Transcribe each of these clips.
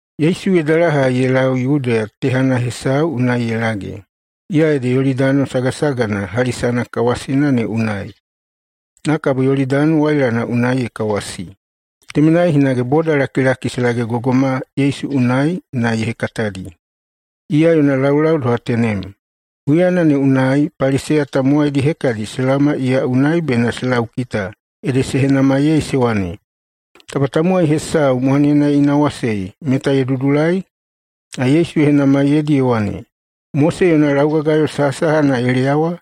Yesu ye dalahai ye lau Yudeya tehana hesau unai ye lage, iya ede Yolidani sagasagana hali sanakawasina ne unai. Na kabo Yolidani wailana unai ye kawasi. Temenai hinage bodalakilaki se lagegogoma Yesu unai na ye hekatadi. Iya yona laulau doha tenem. Huyana ne unai Paliseya tamowaidi hekadi se laoma iya unai bena se laukita ede se henamaiyei se wane, “Taba tamowai hesau mwanena ye inawasei, meta ye dudulai?” Na Yesu ye henamaiyeidi ye wane, “Mose yona laugagayo sahasahana ye leyawa?”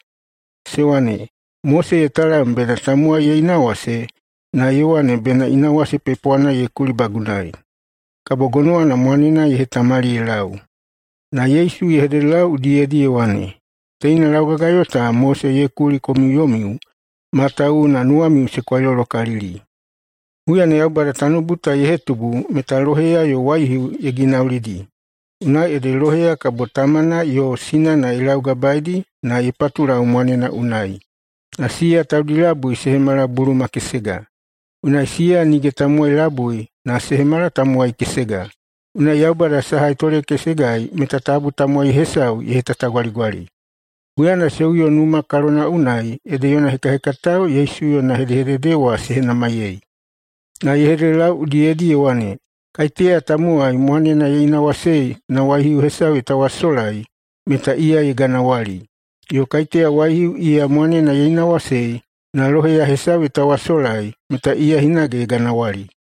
Se wane, “Mose ye talam bena tamowai ye inawase, na ye wane bena inawase pepwana ye kulibagunai, kabo gonowana mwanena ye hetamali ye lau.” Na Yesu ye hededelau udiyedi ye wane, “Teina laugagayo ta Mose ye kuli komiu yomiu, matawuwuna nuwamiu se kwailolokalili. Huyana Yaubada tanoubu ta ye hetubu meta loheya yo waihiu ye ginaulidi. Unai ede loheya kabo tamana yo sinana ye laugabaeidi na ye patulau mwanena unai, na siya taudi labui se hemala buluma kesega. Unai siya nige tamowai labui, na se hemala tamowai kesega. Unai Yaubada saha ye tolekesegai meta tabu tamowai hesau ye hetatagwaligwali.” Huyana se uyo numa kalona unai ede yona hekahekatao Yesu yona hedehedede wa se henamaiyei. Na ye hededelau udiyedi ye wane, “Kaiteya tamowai mwanena ye inawasei na waihiu hesau ye tawasolai, meta iya ye ganawali. Yo kaiteya waihiu iya mwanena ye inawasei na loheya hesau ye tawasolai, meta iya hinage ye ganawali.”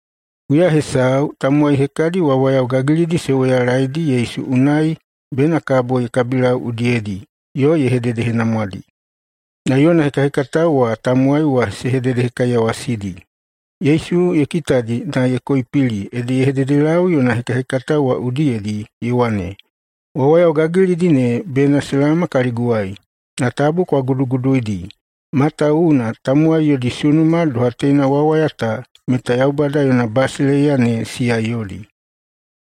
[Huya hesau,] tamowai hekadi wawayao gagilidi se woyalaedi Yesu unai bena kabo ye kabilau udiyedi [yo ye hededehenamwadi]. Na yona hekahekatao wa tamowai wa se hededehekaiyawasidi. Yesu ye kitadi na ye koipili ede ye hededelau yona hekahekatao wa udiyedi ye wane, “Wawayao gagilidi ne bena se laoma kaliguwai, na tabu kwa guduguduidi, matawuwuna tamowai yodi sunuma doha teina wawayao ta meta Yaubada yona basileiya ne siya yodi.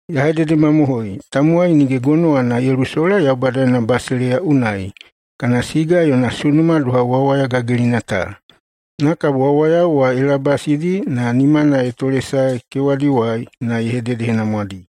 Ya hededemamohoi: Tamowai nige gonowana ye lusola Yaubada yona basileiya unai kana siga yona sunuma doha wawaya gagilina ta.” Na kabo wawayao wa ye labasidi na nimana ye tolesaedi kewadiwai na ye hededehenamwadi.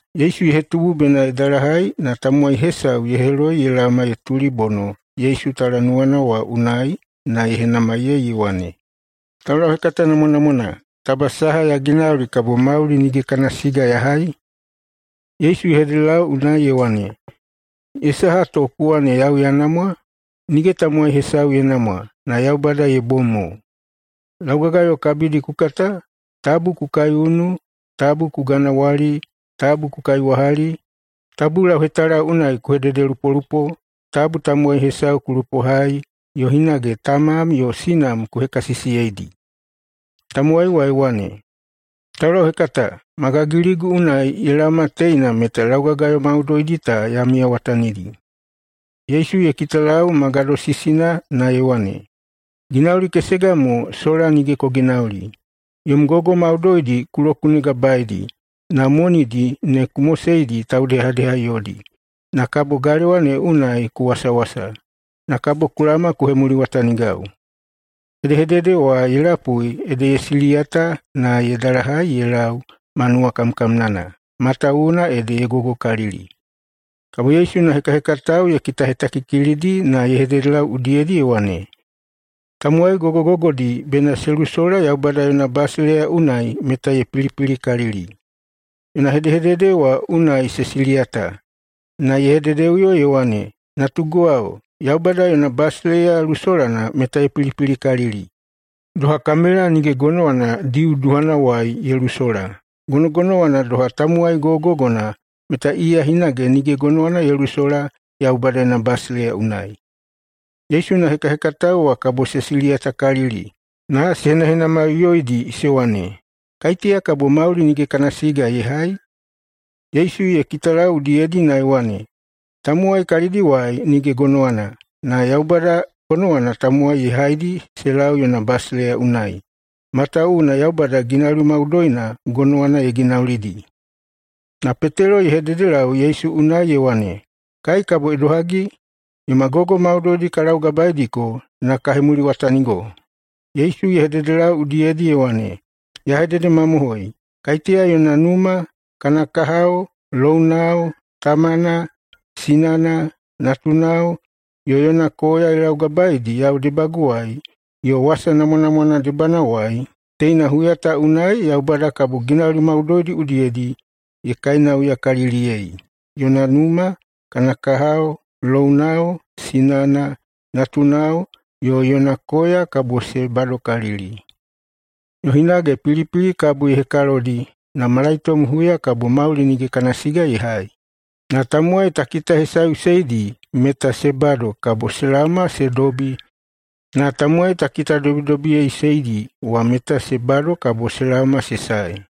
Yesu ye hetubu bena ye dalahai, na tamowai hesau ye heloi ye laoma ye tulibono Yesu talanuwana wa unai na ye henamaiyei ye wane, “Taulauhekata namwanamwana, taba saha ya ginauli kabo mauli nige kana siga ya hai?” Yesu ye hededelau unai ye wane, “Ye saha to ku wane yau ya namwa? Nige tamowai hesau ye namwa, na Yaubada ye bom mo. Laugagayo kabidi ku kata: Tabu ku kaiunu, tabu ku ganawali, tabu ku kaiwahali, tabu lauhetala unai ku hededelupolupo, tabu tamowai hesau ku lupohai, yo hinage tamam yo sinam ku hekasisiyeidi.” Tamowai wa ye wane, “Taulauhekata, ma gagiligu unai ye laoma teina meta laugagayo maudoidi ta ya miyawatanidi.” Yesu ye kitalau ma gadosisina na ye wane, “Ginauli kesega mo sola nige ku ginauli. Yom gogo maudoidi ku lokunegabaeidi, na monidi ne ku moseidi taudehadeha yodi, na kabo galewa ne unai ku wasawasa. Na kabo ku laoma ku hemuliwatanigau.” Hedehedede wa ye lapui ede ye siliyata na ye dalahai ye lau ma nuwakamkamnana, matawuwuna ede ye gogokalili. Kabo Yesu yona hekahekatao ye kitahetakikilidi na ye hededelau udiyedi ye wane, “Tamowai gogogogodi bena se lusola Yaubada yona basileiya unai meta ye pilipilikalili.” Yona hedehedede wa unai se siliyata. Na ye hededeꞌuyo ye wane, “Natuguwao, Yaubada yona basileiya lusolana meta ye pilipilikalili. Doha kamela nige gonowana diu duhanawai ye lusola, gonogonowana doha tamowai gogogogona meta iya hinage nige gonowana ye lusola Yaubada yona basileiya unai.” Yesu yona hekahekatao wa kabo se siliyatakalili na se henahenamaiꞌuyoidi se wane, “Kaiteya kabo mauli nige kana siga ye hai?” Yesu ye kitalau udiyedi na ye wane, “Tamowai kalidiwai nige gonowana, na Yaubada [gonowana tamowai ye haidi se lau yona basileiya unai.] Matawuwuna Yaubada ginauli maudoina gonowana ye ginaulidi.” Na Petelo ye hededelau Yesu unai ye wane, “Kai kabo idohagi? Yoma gogo maudoidi ka laugabaeidiko na ka hemuliwatanigo.” Yesu ye hededelau udiyedi ye wane, “Ya hededemamohoi: Kaiteya yona numa, kana kahao, lounao, tamana, sinana, natunao, yo yona koya ye laugabaedi yau debaguwai yo wasa namwanamwana debanawai, teina huya ta unai Yaubada kabo ginauli maudoidi udiyedi ye kainauyakaliliyei, yona numa, kana kahao, lounao, sinana, natunao, yo yona koya kabo se badokalili. Yo hinage pilipili kabo ye hekalodi, na malaitom huya kabo mauli nige kana siga ye hai. Na tamowai ta kitahesaeꞌuseidi meta se bado kabo se laoma se dobi, na tamowai ta kitadobidobiyeiꞌuseidi wa meta se bado kabo se laoma se sae.”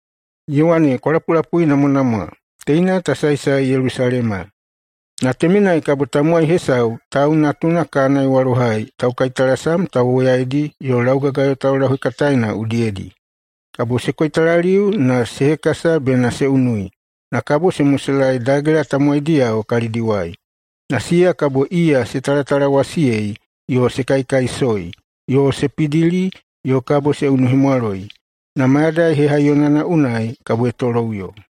Ye wane, “Kwa lapulapuinamwanamwa! Teina ta saesae Yelusalema. Na temenai kabo tamowai hesau Tau Natuna kana ye walohai taukaitalasam tauwoyaidi yo laugagayo taulauhekataena udiyedi. Kabo se koitalaliu na se hekasa bena se unui, na kabo se moselaei dagela tamowaidiyao kalidiwai. Na siya kabo iya se talatalawasiyei yo se kaikaisoi yo se pidili yo kabo se unuhemwaloi. Na mayadai hehaiyonana unai kabo ye toloꞌuyo.”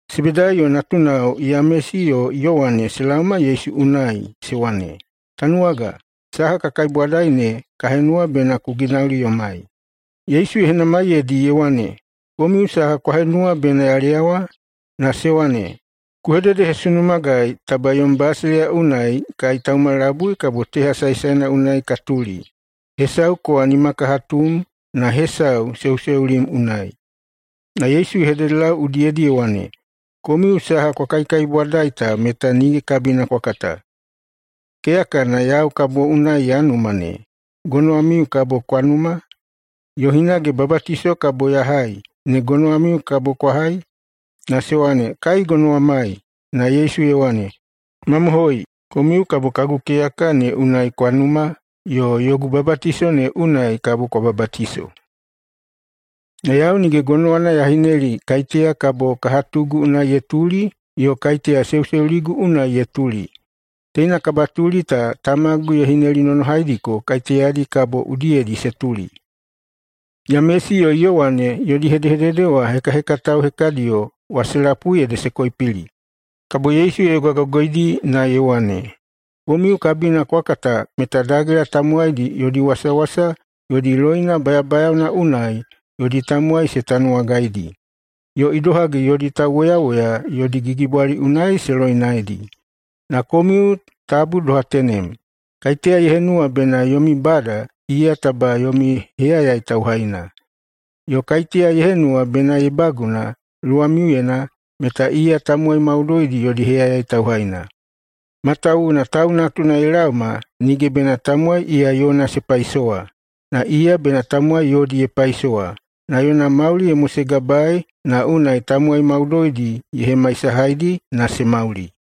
Sebedaiyo natunao Yamesi yo Yowane se laoma Yesu unai se wane, “Tanuwaga, saha ka kaibwadai ne, ka henuwa bena ku ginauli yomai.” Yesu ye henamaiyeidi ye wane, “Komiu saha kwa henuwa bena ya leyawa?” Na se wane, “Ku hededehesunumagai taba yom basileiya unai kai tauma labui kabo teha saesaena unai ka tuli, hesau kowa nimakahatum na hesau seuseulim unai.” Na Yesu ye hededelau udiyedi ye wane, “Komiu saha kwa kaikaibwadai ta meta nige kabina kwa kata. Keyakana yau kabo unai ya numa ne, gonowamiu kabo kwa numa? Yo hinage babatiso kabo ya hai ne gonowamiu kabo kwa hai?” Na se wane, “Kai gonowamai.” Na Yesu ye wane, “Mamohoi! Komiu kabo kagu keyaka ne unai kwa numa, yo yogu babatiso ne unai kabo kwa babatiso. Na yau nige gonowana ya hineli kaiteya kabo kahatugu unai ye tuli yo kaiteya seuseuligu unai ye tuli. Teina kabatuli ta tamagu ye hinelinonohaidiko kaiteyadi kabo udiyedi se tuli.” Yamesi yo Yowane yodi hedehedede wa hekahekatao hekadiyo wa se lapui ede se koipili. Kabo Yesu ye yogagogoidi na ye wane, “Komiu kabina kwa kata meta dagela tamowaidi yodi wasawasa yodi loina bayabayaona unai yodi tamowai se tanuwagaidi, yo idohagi yodi tauwoyawoya yodi gigibwali unai se loinaedi. Na komiu tabu doha tenem. Kaiteya ye henuwa bena yomi bada, iya taba yomi heyayai tauhaina. Yo kaiteya ye henuwa bena ye baguna luwamiuyena, meta iya tamowai maudoidi yodi heyayai tauhaina. Matawuwuna Tau Natuna ye laoma nige bena tamowai iya yona se paisowa, na iya bena tamowai yodi ye paisowa na yona mauli ye mosegabaei na unai tamowai maudoidi ye hemaisahaidi na se mauli.”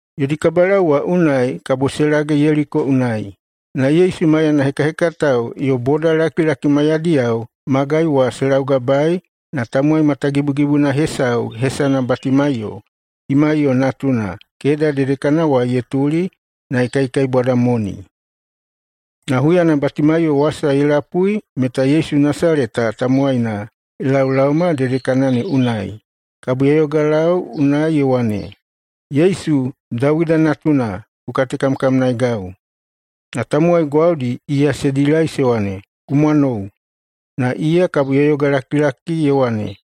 Yodi kabalau wa unai kabo se lage Yeliko unai. Na Yesu maiyana hekahekatao yo bodalakilaki maiyadiyao magai wa se laugabae, na tamowai matagibugibuna hesau hesana Batimaiyo, Timaiyo natuna, keda dedekanawai ye tutuli na ye kaikaibwada moni. Na huyana Batimaiyo wasa ye lapui meta Yesu Nasaleta tamowaina ye laolaoma dedekana ne unai, kabo ye yogalau unai ye wane, “Yesu, Dawida Natuna, ku katekamkamnaegau!” Na tamowai gwaudi iya se dilai se wane, “Ku mwanou!” Na iya kabo ye yogalakilaki na ye wane,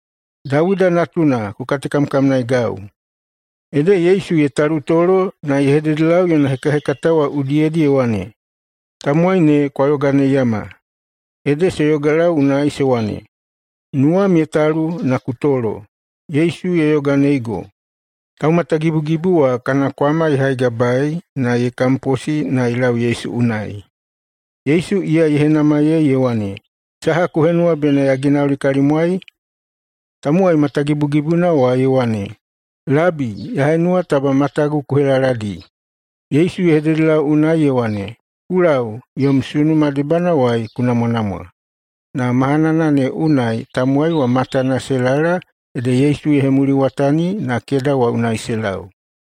“Dawida Natuna, ku katekamkamnaegau!” Ede Yesu ye talutolo na ye hededelau yona hekahekatao wa udiyedi ye wane, “Tamowai ne kwa yoganeiyama.” Ede se yogalau unai se wane, “Nuwam ye talu na ku tolo! Yesu ye yoganeigo!” Taumatagibugibu wa kana kwama ye haigabaei na ye kamposi na ye lau Yesu unai. Yesu iya ye henamaiyei ye wane, “Saha ku henuwa bena ya ginauli kalimwai?” Tamowai matagibugibuna wa ye wane, “Labi, ya henuwa taba matagu ku helaladi.” Yesu ye hededelau unai ye wane, “Ku lau, yom sunuma debanawai ku namwanamwa.” Na mahanana ne unai tamowai wa matana se lala ede Yesu ye hemuliwatani na keda wa unai se lau.